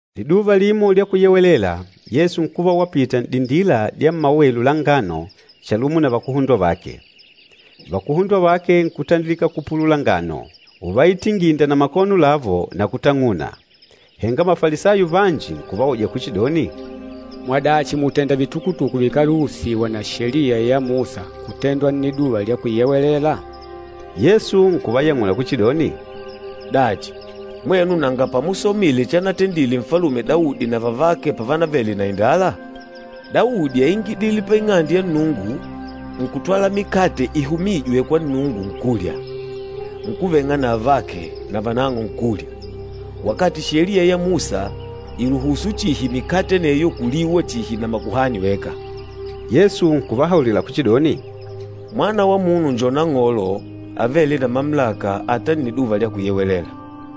Liduva limo lya Kuyewelela, Yesu nkuva wapita n'dindila dya mmawelu la ngano chalumo na vakuhundwa vake. Vakuhundwa vake nkutandilika kupulula ngano, uvaitinginda na makono lavo na kutang'una. Henga Mafalisayo vanji nkuvauja kuchidoni, “Mwadachi mùtenda vitukutuku vikáluhusiwa na Sheliya ya Musa kutendwa Nniduva lya Kuyewelela?” Yesu nkuvayang'ula kuchidoni, “Dachi, mwenu nanga pamusomile chanatendile Nfalume Daudi na vavake pavanavele na indala? Daudi áingidile pa Ing'ande ya Nnungu, nkutwala mikate ihumîjwe kwa Nnungu nkulya, nkuveng'a na avake navanang'o nkulya, wakati Sheliya ya Musa ìluhusu chihi mikate aneyo kuliwa chihi na makuhani weka.” Yesu nkuvahaulila kuchidoni, “Mwana wa Munu njo Nang'olo avêle na mamulaka ata Nniduva lya Kuyewelela.”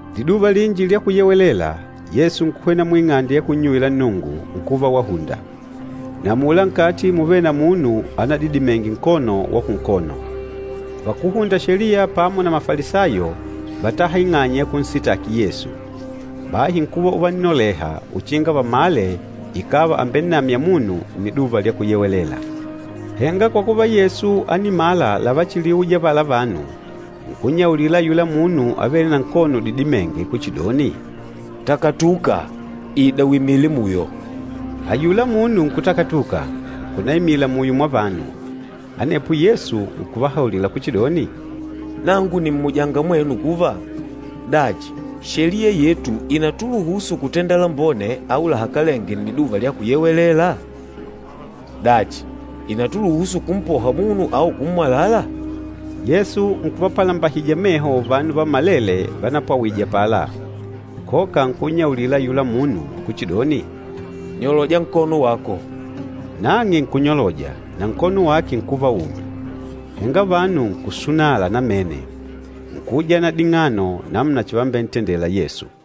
Liduva linji lya Kuyewelela, Yesu nkuhwena muing'ande ya kunnyuwila Nnungu, nkuva wahunda. Na amula nkati múvele na munu anadidimenge nkono wa kunkono. Vakúhunda Sheliya pamo na Mafalisayo vátaha ing'anya ya kunsitaki Yesu. Bahi nkuva uvannoleha uchinga vamale ikàva àmbennamya munu Nniduva lya Kuyewelela. Henga kwa kuva Yesu ánimala lavachiliuja avala vanu, nkunnyaulila ayula munu avêle na nkono udidimênge kuchidoni, “Takatuka, ida uimile muyo.” Ayula munu nkutakatuka, nkunaimila muyo mwa vanu. Anepo Yesu nkuvahaulila kuchidoni, “Nangu nìmmujanga mwenu kuva, dachi Sheliya yetu ìnatuluhusu kutenda lambone au lahakalenge Nniduva lya Kuyewelela? Dachi, ìnatuluhusu kumpoha munu au kummwalala?” Yesu nkuvapalambahija meho vanu vammalele vanapwawije apala, koka nkunnyaulila ayula munu kuchidoni, “Nyoloja nkono wako.” Nang'e nkunyoloja, na nkono wake nkuva umi. Henga vanu nkusunala namene, nkuujana ding'ano namuna chivambentendela Yesu.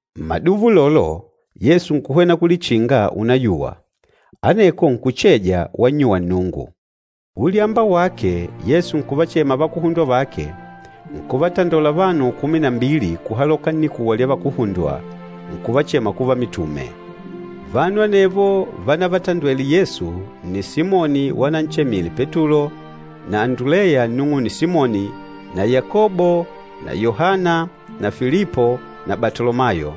Mmaduva ulolo, Yesu nkuhwena kulichinga unayuwa, aneko nkucheja wannyuwa Nnungu. Ulyamba wake, Yesu nkuvachema vakuhundwa vake, nkuvatandola vanu kumi na mbili kuhaloka nnikuwa lya vakuhundwa, nkuvachema kuva mitume. Vanu anevo vanavatandwele Yesu nni Simoni wananchemile Petulo, na Anduleya nnung'une Simoni na Yakobo na Yohana na Filipo na Batolomayo,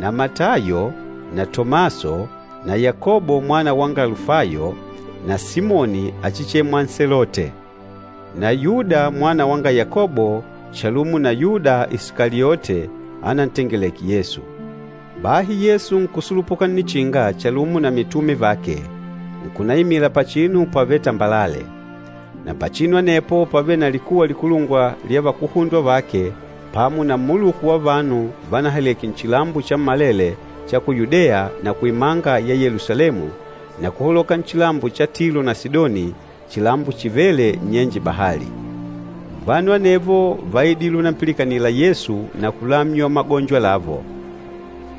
na Matayo na Tomaso na Yakobo mwana wanga Alufayo na Simoni achichemwa Nselote, na Yuda mwana wanga Yakobo chalumo na Yuda Isikaliote, anantengeleke Yesu. Bahi Yesu nkusulupuka nnichinga chalumo na mitume vake, nkunaimila pachinu pavêle tambalale. Na pachinu anepo pávele na likuwa likulungwa lya vakuhundwa vake pamo na mmuluku wa vanu vanahaleke nchilambo chammalele cha ku Yudeya na kuimanga ya Yelusalemu, na kuhaloka nchilambo cha Tilo na Sidoni, chilambo chivêle nnyenje bahali. Vanu anevo váidile unampilikanila Yesu na kulamywa magonjo lavo.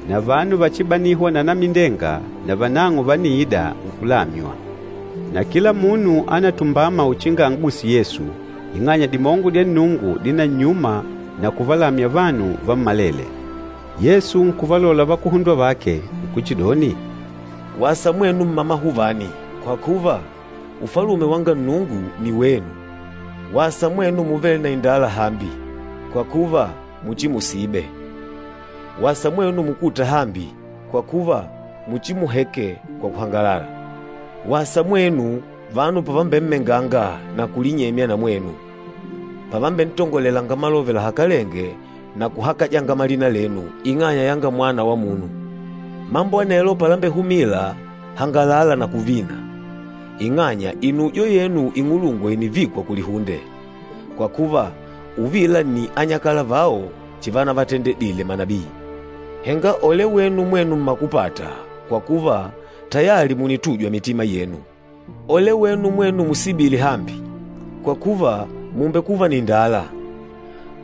Na vanu vachibanîhwa na anamindenga, navanang'o vániida nkulamywa. Na kila munu ánatumbama uchinga an'guse Yesu, ing'anya dimongo dya Nnungu dínannyuma na kuvalamya vanu vammalele. Yesu nkuvalola vakuhundwa vake, nkuchidoni, “Wasa mwenu mmamahuvani, kwa kuva, Ufalume wanga Nnungu ni wenu! Wasa mwenu muvêle na indala hambi, kwa kuva, muchimusibe! Wasa mwenu mukûta hambi, kwa kuva, muchimuheke kwa kuhangalala. Wasa mwenu, vanu pavambemmenganga na kulinyemya na mwenu, pavambentangolelanga malove lahakalenge na kuhakajanga malina lenu ing'anya yanga Mwana wa Munu. Mambo anelo palambehumila, hangalala na kuvina, ing'anya inujo yenu ing'ulungwa ìnivikwa kulihunde. Kwa kuva, uvila nni anyakala vao chivanavatendile manabii. Henga ole wenu mwenu mmakupata, kwa kuva, tayali mùnitujwa mitima yenu! Ole wenu mwenu musibîle hambi, kwa kuva, mùmbekuva na indala.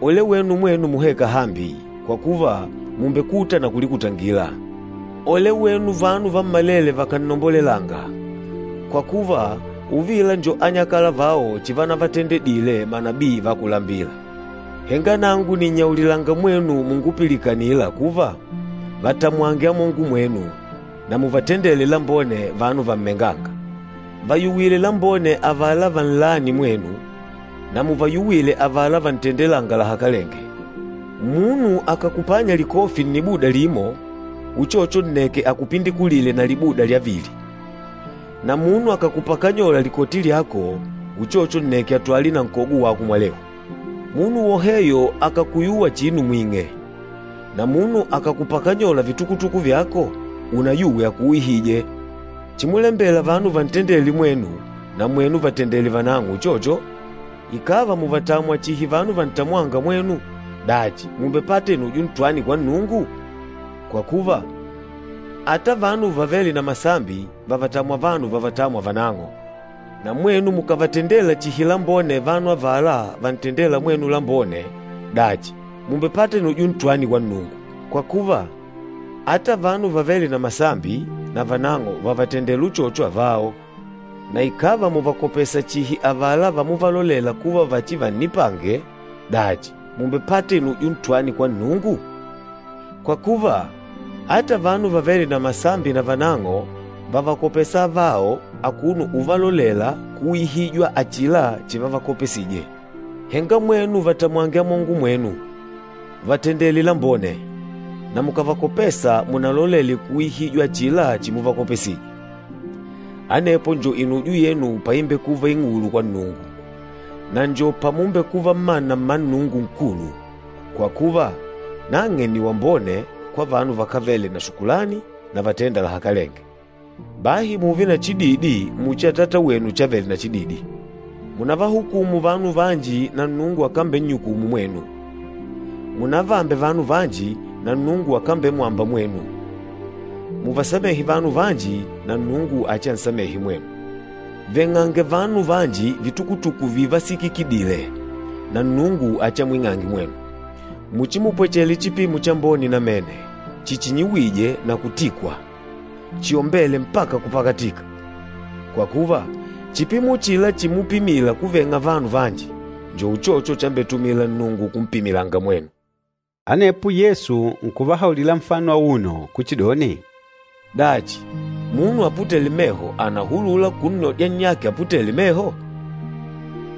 Ole wenu mwenu muhêka hambi, kwa kuva, mùmbekuta na kulikutangila. Ole wenu vanu vammalele vakànnombolelanga! Kwa kuva, uvila njo anyakala vao chivanavatendedile manabii va kulambila!” “Henga nangu nìnnyaulilanga mwenu mungupilikanîla kuva, vatamwange amongo mwenu. Na muvatendele lambone vanu vammengânga. Vayuwile lambone avala vannâni mwenu, na muvayuwile avala vantendelânga lahakalenge. Munu akàkupanya likofi nnibuda limo, uchocho nneke akupindikulile na libuda lya vili. Na munu akàkupakanyola likoti lyako, uchocho nneke atwale na nkogo wako mwalehu. Munu woheyo akàkuyuwa chinu mwing'e, na munu akàkupakanyola vitukutuku vyako, unayuwe akuuyihije. Chimulembela vanu vantendele mwenu, na mwenu vatendele vanang'o uchocho. Ikàva mùvatamwa chihi vanu vantamwânga mwenu, dachi, mùmbepata inujo ntwani kwa Nnungu? Kwa kuva, ata vanu vavêle na masambi vàvatamwa vanu vavatâmwa vanang'o. Na mwenu mukàvatendela chihi lambone vanu avala vantendêla mwenu lambone, dachi mùmbepata inujo ntwani kwa Nnungu? Kwa kuva, ata vanu vavêle na masambi navanang'o vàtenda uchocho avao. Na ikàva mùvakopesa chihi avala vamuvalolela kuva vachivannipange, dachi mùmbepata inujo ntwani kwa Nnungu? Kwa kuva, ata vanu vavêle na masambi navanang'o vàvakopesa avao akuno uvalolela kuuyihijwa achila chivavakopesije. Henga mwenu vatamwange amongo mwenu, vatendele lambone, na mukàvakopesa munalolele kuuyihijwa achila chimuvakopesije. Anepo njo inujo yenu paimbekuva ing'ulu kwa Nnungu, na njo pamumbekuva mmana mma Nnungu Nkulu, kwa kuva, nang'e nni wambone kwa vanu vakávele na shukulani na vatênda lahakalenge. Bahi mùùve na chididi muchi Atata wenu chavele na chididi.” “Munavahukùmù vanu vanji na Nnungu akambennyukumu mwenu. Munavaambe vanu vanji, na Nnungu akambemwamba mwenu. Muvasamehe vanu vanji, na Nnungu achiansamehe mwenu. Veng'ange vanu vanji vitukutuku vivasikikidile, na Nnungu achiamwing'ange mwenu. Muchimupwechele chipimo chambone namene, chichinyiwîje na kutikwa, chiombêle mpaka kupakatika. Kwa kuva, chipimo uchila chimupimila kuveng'a vanu vanji, njo uchocho chambetumila Nnungu kumpimila mwenu.” Anepo Yesu nkuvahaulila nfano auno kuchidoni, “Dachi, munu aputêle meho ànahulula kunnodya nnyake aputêle meho?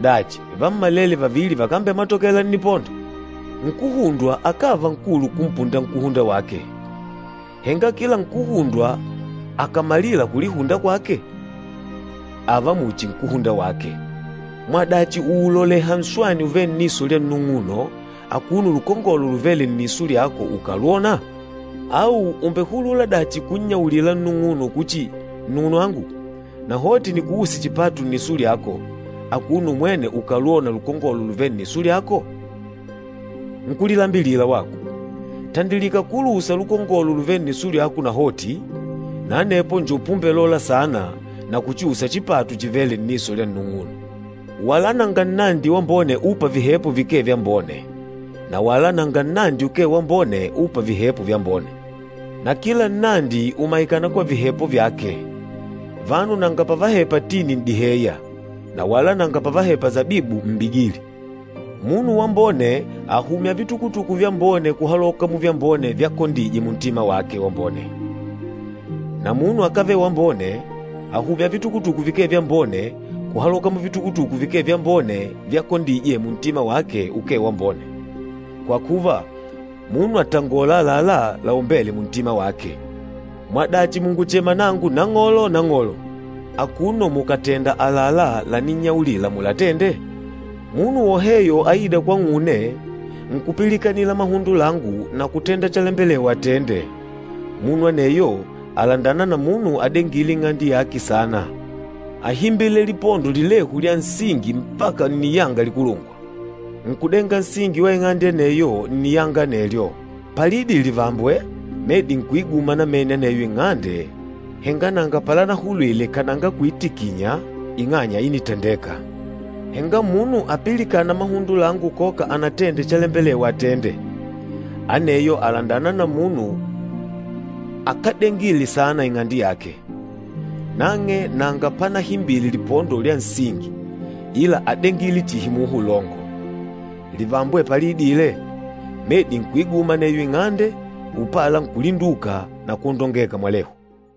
Dachi, vammalele vavili vakambematokela nnipondo? Nkúhundwa akáva nkulu kumpunda nkúhunda wake, henga kila nkúhundwa akàmalila kulihunda kwake, ààva muchi nkúhunda wake. Mwadachi ùuloleha nswani uvêle nniso lya nnung'uno, akuno lukongolo luvêle nniso lyako ukalwònà? Au ùmbehulula dachi kunnyaulila nnung'uno kuchi, ‘Nnung'unwangu, nahoti nikuuse chipatu nniso lyako,’ akuno umwene ukálwònà lukongolo luvêle nniso lyako? Nkúlilambilila wako! Tandilika kuluusa lukongolo luvêle nniso lyako nahoti, na anepo njo pumbelola saana na kuchiusa chipatu chivêle nniso lya nnung'uno.” “Wala nanga nnandi wambone ûpa vihepo vikee vyambone, na wala nanga nnandi ukee wambone ûpa vihepo vyambone. Na kila nnandi ùmaikana kwa vihepo vyake. Vanu nanga pavahepa tini n'diheya, na wala nanga pavahepa sabibu mmbigili. Munu wambone àhumya vitukutuku vyambone kuhaloka muvyambone vyakondije muntima wake wambone, na munu akávele wambone àhumya vitukutuku vikee vyambone kuhaloka muvitukutuku vikee vyambone vyakondije muntima wake ukee wambone. Kwa kuva, munu àtangola àlalá laombêle muntima wake.” “Mwadachi mùnguchema nangu, ‘Nang'olo, Nang'olo,’ akuno mukatèndà àlalá laninnyaulila mulatende? Munu woheyo aîda kwang'une, nkupilikanila mahundo langu na kutenda chalembelewa atende, munu aneyo àlandana na munu adengîle ing'ande yake saana. Áhimbile lipondo lilehu lya nsingi mpaka nniyanga likulungwa, nkudenga nsingi wa ing'ande aneyo nniyanga anelyo. Paliidile livambwe, medi nkuiguma namene aneyo ing'ande henga nanga palanahulwile kananga kuitikinya ing'anya ínitandeka. Henga munu apilikâna mahundo langu koka anatende chalembelewa atende, aneyo àlandana na munu akádengile saana ing'ande yake. Nang'e nanga panahimbile lipondo lya nsingi, ila ádengile chihi muha ulongo. Livambwe paliidile, medi nkuiguma aneyo ing'ande, upala nkulinduka na kwondongeka mwalehu!”